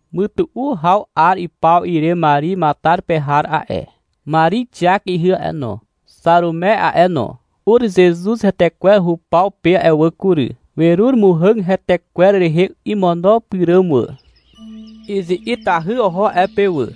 Mytu'u haw 'ar ipaw ire Mari Matar pe har a'e, Mari Xiak ihy a'e no, Xarume a'e no, ur Zezuz hetekwer hupaw pe a'e wà kury. Werur muhàg hetekwer rehe imono pyràm wà. Izi'itahy oho a'e pe wà.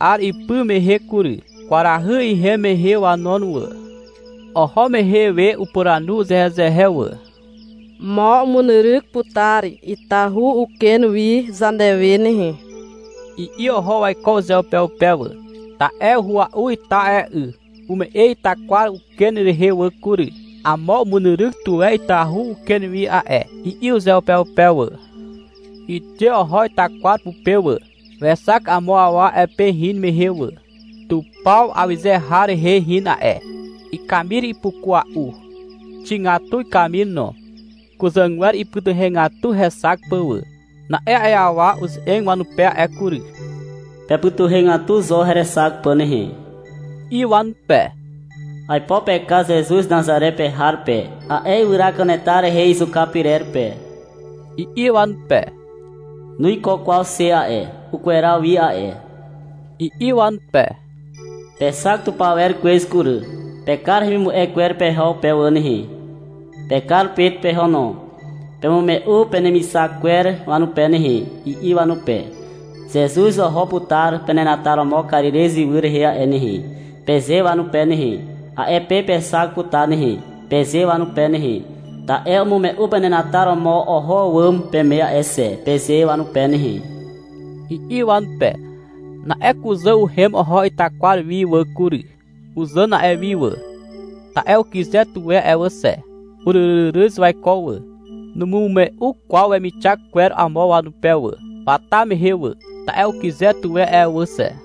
'Ar ipy mehe kury. Kwarahy ihem mehe wanon wà. Oho mehe we upuranu uzehezehe wà. — Mo umunyryk putar itahu uken wi zanewe nehe, i'i oho waiko uzeupeupe wà. Ta'e uhua'u ita a'e 'y. Ume'e itakwar uken rehe wà kury. — Amo umunyryk tuwe itahu uken wi a'e, i'i uzeupeupe wà. Wixe oho itakwar pupe wà. Wexak amo awa a'e pe hin mehe wà. Tupaw awyze har rehe hin a'e. Ikamir ipukua'u. Xigatu ikamir no. Kuzàgwer ipytuhegatu hexak pà wà. Na'e a'e awa uze'eg wanupe a'e kury. — Pepytuhegatu zo herexak pà nehe, i'i wanupe. — Aipo pekar Zezuz Nazare pe har pe, a'e ywyra kanetar rehe izuka pyrer pe, i'i wanupe. — Nuiko kwaw xe a'e. Ukweraw wi a'e, i'i wanupe. — Pexak tupawer kwez kury. Pekar hemimu'e kwer peho pe wà nehe. Pekar Pet peho no. Pemume'u penemixak kwer wanupe nehe, i'i wanupe. — Zezuz oho putar penenataromo Karirez ywy rehe a'e nehe, peze wanupe nehe. — A'e pe pexak putar nehe, peze wanupe nehe. — Ta'e umume'u penenataromo oho àwàm peme a'e xe, peze wanupe nehe, i'i wanupe. Na'e kuzà uhem oho itakwar wi wà kury. Uzàn a'e wi wà, ta'e ukyze tuwe a'e wà xe. Uryryryryz waiko wà. Numume'u kwaw wemixak kwer amo wanupe wà, wata mehe wà, ta'e ukyze tuwe a'e wà xe.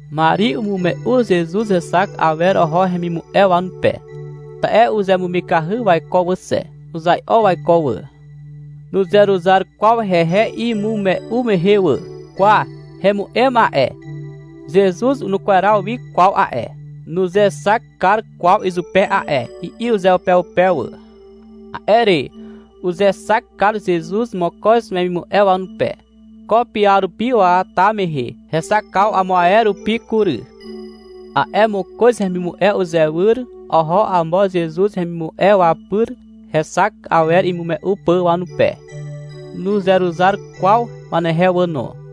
Mari umume'u Zezuz hexak awer oho hemimu'e wanupe, ta'e uzemumikahy waiko wà xe. Uzai'o waiko wà. Nuzeruzar kwaw hehe imume'u mehe wà. — Kwa, hemu'em a'e, Zezuz nukweraw wi kwaw a'e, nuzexak kar kwaw izupe a'e, i'i uzeupeupe wà. A'e re, uzexak kar Zezuz mokoz wemimu'e wanupe, ko piarupi waata mehe. Hexakaw amo ae rupi kury. A'e mokoz hemimu'e uzewyr oho amo Zezuz hemimu'e wapyr hexak awer imume'u pà wanupe. Nuzeruzar kwaw wanehe wà no.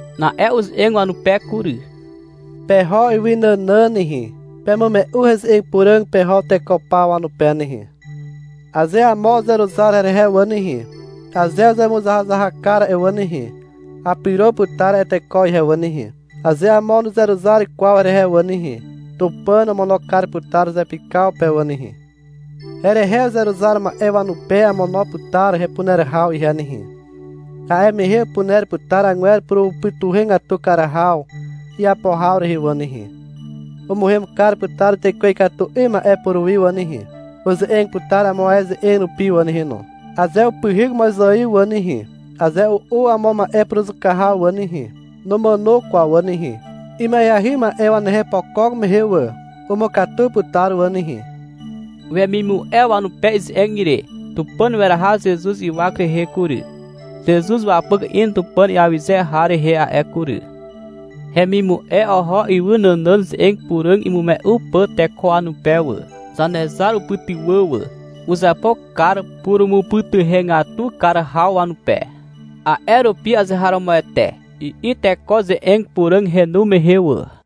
Na'e uze'eg wanupe kury. — Peho ywy nànàn nehe, pemume'u Heze'eg Puràg peho teko paw wanupe nehe. Aze amo uzeruzar herehe wà nehe, aze uzemuzahazahak kar a'e wà nehe, apyro putar a'e teko ihe wà nehe. Aze amo nuzeruzar kwaw herehe wà nehe, Tupàn omono kar putar zepykaw pe wà nehe. Herehe uzeruzar ma'e wanupe amono putar hepuner haw ihe nehe. A'e mehe upuner putar agwer purumupytuhegatu kar haw iapo haw rehe wà nehe: umuhem kar putar tekwe ikatu 'ym ma'e puruwi wà nehe. Uze'eg putar amo ae ze'eg rupi wà nehe no. Aze upyhyk mozaiw wà nehe, aze u'u amo ma'e puruzuka haw wà nehe, numàno kwaw wà nehe. Ima'eahy ma'e wanehe opokok mehe wà, umukatu putar wà nehe. Wemimu'e wanupe ize'eg ire, Tupàn weraha Zezuz ywak rehe kury. Zezuz wapyk in Tupàn iawyze har rehe a'e kury. Hemimu'e oho ywy nànàn Ze'eg Puràg imume'u pà teko wanupe wà. Zanezar upytywà wà. Uzapo kar purumupytuhegatu kar haw wanupe. A'e rupi — Azeharomoete, i'i teko Ze'eg Puràg henu mehe wà].